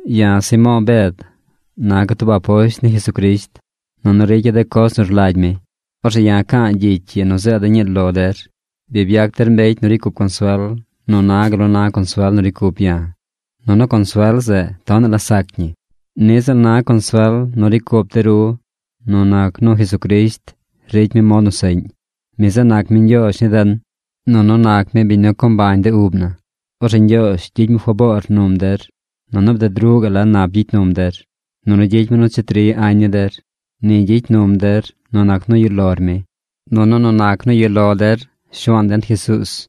Ya̱ Simo̱o̱ Bed naca̱ tub aposht ni Jesucrisht nunu ricya̱ de coz nu rlagy mi. Orzeꞌ ya̱ ca̱a̱ gyicy ii nu zeeda̱ ñii lo der. Bi byac der mbecy nu ricy cup consuel nu na gal nu na consuel nu ricy cup ya̱. Nunu consuel zeꞌ tonaꞌ la sac ñi. Niꞌ ziꞌl na consuel nu ricy cup de ru nu nac nu Jesucrisht ricy mi mod nu seꞌñ. Mi zeꞌ nac mi Ñgyoozh ni den, nunu nac mi biñ nu co mbañ de ub na. Orzeꞌ Ñgyoozh gyicy mi faboor num der, nunu bded ruꞌ gaꞌ la nap gyicy num der. Nunu gyicy mi nu cheti ri añ ni der. Ni gyicy num der nu nac nu yuꞌ lor mi, nunu nu nac nu yuꞌ lo der Shuaan den Jesuuz.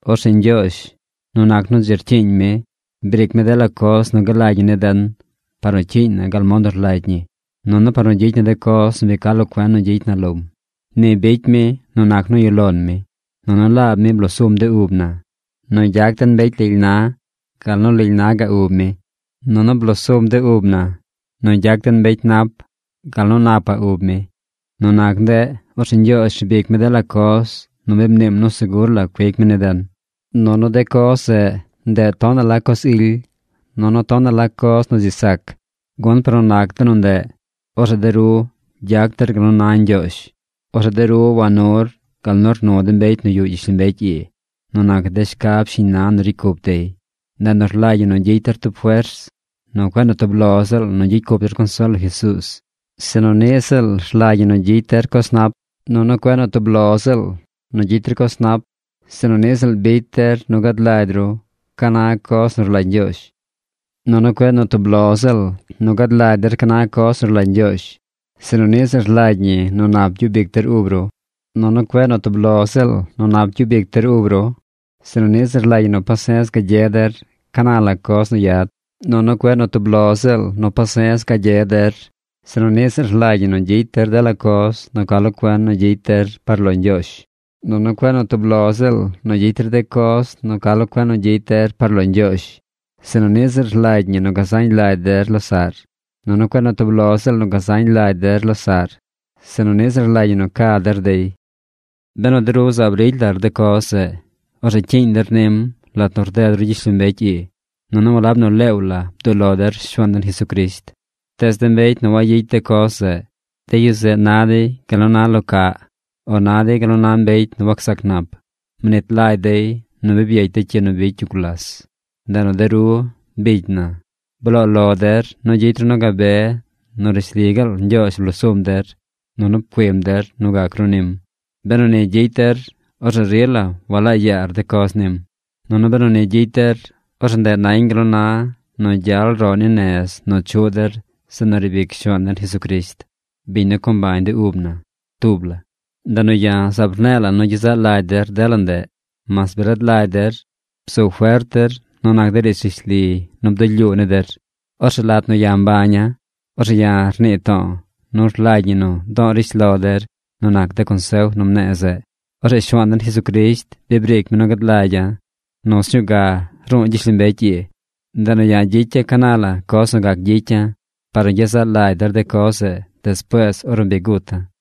Orzeꞌ Ñgyoozh, nu nac nu dzi rcyiiñ mi, briic mi dela coz nu galagy ñi ni den par nu cyiiñ na gal mod nu rlagy ñi, nunu par nu gyicy na de coz nu bi ca lo cuen nu gyicy na lom. Ni bicy mi nu nac nu yuꞌ lon mi. Nunu laab mi blosum de ub na nu gyac den mbecy lily na gal nu lily naꞌ ub mi, nunu blosum de ub na nu gyac den mbecy nap gal nu napaꞌ ub mi. Nu nac ndeꞌ, orzeꞌ Ñgyoozh rbic mi dela coz nu bi mniim nu segur la cuic mi ni den. Nunu de coz zeꞌ, ndeꞌ tonaꞌ la coz ily, nunu tonaꞌ la coz nu dzi sac. Gun par nu nac de nu ndeꞌ, orzeꞌ de ru gyac der gal nu na Ñgyoozh. Orzeꞌ de ru wanur gal nu rnu de mbecy nu yuꞌ gyishlombecy ii nu nac de shcab shiñ na nu ricy cup dey. Ndeꞌ nu rlagy ñi nu gyicy der tub fers nu cueꞌ nu tub lo ziꞌl nu gyicy cup der consuel lo Jesuuz, sinu niꞌ ziꞌl rlagy ñi nu gyicy der coz nap. Nunu cueꞌ nu tub lo ziꞌl nu gyicy der coz nap, sinu niꞌ ziꞌl bicy der nu gad lagy ru ca na coz nu rlagy Ñgyoozh. Nunu cueꞌ nu tub lo ziꞌl nu gad lagy der ca na coz nu rlagy Ñgyoozh, sinu niꞌ ziꞌl rlagy ñi nu nap gyub ic der ub ru. Nunu cueꞌ nu tub lo ziꞌl nu nap gyub ic der ub ru, sinu niꞌ ziꞌl rlagy ñi nu pase̱z gagye der ca na la coz nu yad. Nunu cueꞌ nu tub lo ziꞌl nu pase̱z gagye der, sinu niꞌ ziꞌl rlagy ñi nu gyicy der dela coz nu ca lo cuen nu gyicy der par lo Ñgyoozh. Nunu cueꞌ nu tub lo ziꞌl nu gyicy der de coz nu ca lo cuen nu gyicy der par lo Ñgyoozh, sinu niꞌ ziꞌl rlagy ñi nu gazañ lagy der losaꞌr. Nunu cueꞌ nu tub lo ziꞌl nu gazañ lagy der losaꞌr, sinu niꞌ ziꞌl rlagy ñi nu ca der dey. Benu de ru zaab ricy lar de coz zeꞌ, orzeꞌ cyiiñ der nim lat nu rded ru gyishlombecy ii, nunu walab nu leew la bduꞌ lo der Shuaan den Jesucrisht. Tees de mbecy nu wayicy de coz zeꞌ, de yu zeꞌ na dey gal nu na lo caꞌ, o na dey gal nu na mbecy nu wacsac nap. Mnit lagy dey nu bi byecy de cyi nu bicy yu gulas. Ndeꞌ nu de ru, bicy na, bloo lo der nu gyicy ru nu gabe nu rishli gaal Ñgyoozh blosum der nunu pcuim der nu gac ru nim. Benu ni gyicy der, orzeꞌ rila walaa yaar de coz nim. Nunu benu ni gyicy der, orzeꞌ ndeꞌ nañ gal nu na nu gyal roꞌ ni nez nu chuꞌ der zeꞌ nu riib ic Shuaan den Jesucrisht, biñ nu co mbañ de ub na, tub la. Ndeꞌ nu ya̱ zaab rne̱e̱ la̱ nu gyezaꞌ lagy der dela ndeꞌ, mas bi rad lagy der, bzu fert der nu nac de riidz rishli nu bdulyuu ni der. Orzeꞌ lat nu ya̱ mbaña̱, orzeꞌ ya̱ rnii to̱o̱ nu rlagy ñi nu do̱o̱ rishlo der nu nac de consef nu mne̱e̱ zeꞌ. Orzeꞌ Shuaan den Jesucrisht bi briic mi nu gad lagya̱ nu sñuu ga ru̱u̱ gyishlombecy ii. Ndeꞌ nu ya̱ gyicya̱ ca na la coz nu gac gyicya̱ par nu gyezaꞌ lagy der de coz zeꞌ despuees ornu bi guta̱.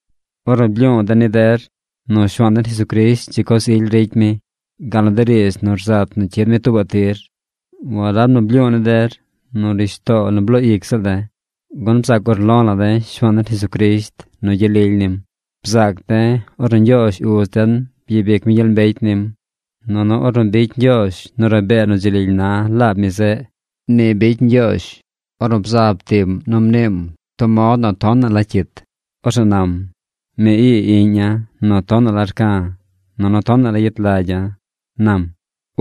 Ornu blyu̱u̱ de̱ ni der nu Shuaan den Jesucrisht dzi coz ily ricy mi, gal nu de riidz nu rzat nu cyid mi tuubaꞌ tir, walab nu blyu̱u̱ ni der nu rishtoo nu bloo ic ziꞌl de̱. Gun bzaac urlo̱ la̱ de̱ Shuaan den Jesucrisht nu gyel lily nim. Bzaac de̱ ornu Ñgyoozh Uz den byabic mi gyel mbecy nim, nunu ornu bicy Ñgyoozh nu rabee nu dzi lily na laab mi zeꞌ. Ni bicy Ñgyoozh ornu bzab tiꞌm nu mniim tub mod nu tonaꞌ la cyit na. Orzeꞌ nam: “Mi ii Iꞌña̱ nu tonaꞌ la rca̱. Nunu tonaꞌ la yet lagya̱”, nam.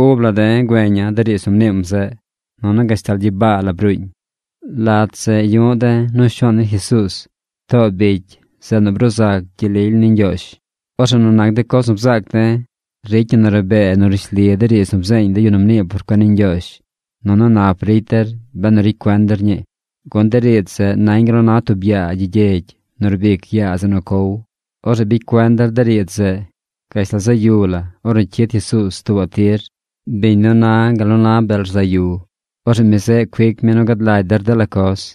Ub la de̱ güeña̱ de riidz nu mniim zeꞌ. Nunu gashtal gyibaa la bruuñ. Lat zeꞌ yu̱ꞌ de̱ nu Shuaan den Jesuuz too bicy zeꞌ nu bruu zac gyel lily ni Ñgyoozh. Orzeꞌ nu nac de coz nu bzaac de̱, ricy ñi nu rabee nu rishli de riidz nu bzeeñ de yu nu mnii por cuen ni Ñgyoozh. Nunu nap ricy der benu ricy cuen der ñii. Gun de riidz zeꞌ nañ gal nu na tub yaa gyi gyegy nu rbic yaa zeꞌ nu cow. Orzeꞌ bicy cuen der de riidz zeꞌ gashtal zaꞌ yu la ornu cyid Jesuuz tuubaꞌ tir, biñ nu na gal nu na bel rzaꞌ yu. Orzeꞌ mi zeꞌ cuic mi nu gad lagy der dela coz.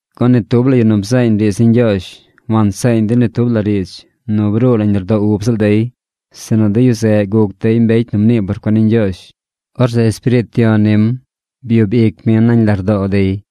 Gun ni tub la yu nu bzeeñ riidz ni Ñgyoozh wanseeñ dey ni tub la riidz nu bruu nañ lardoo ub ziꞌl dey, sinu de yu zeꞌ guc dey mbecy nu mnii por cuen ni Ñgyoozh. Orzeꞌ Espiriit Yon nim byub ic mi nañ lardoo dey.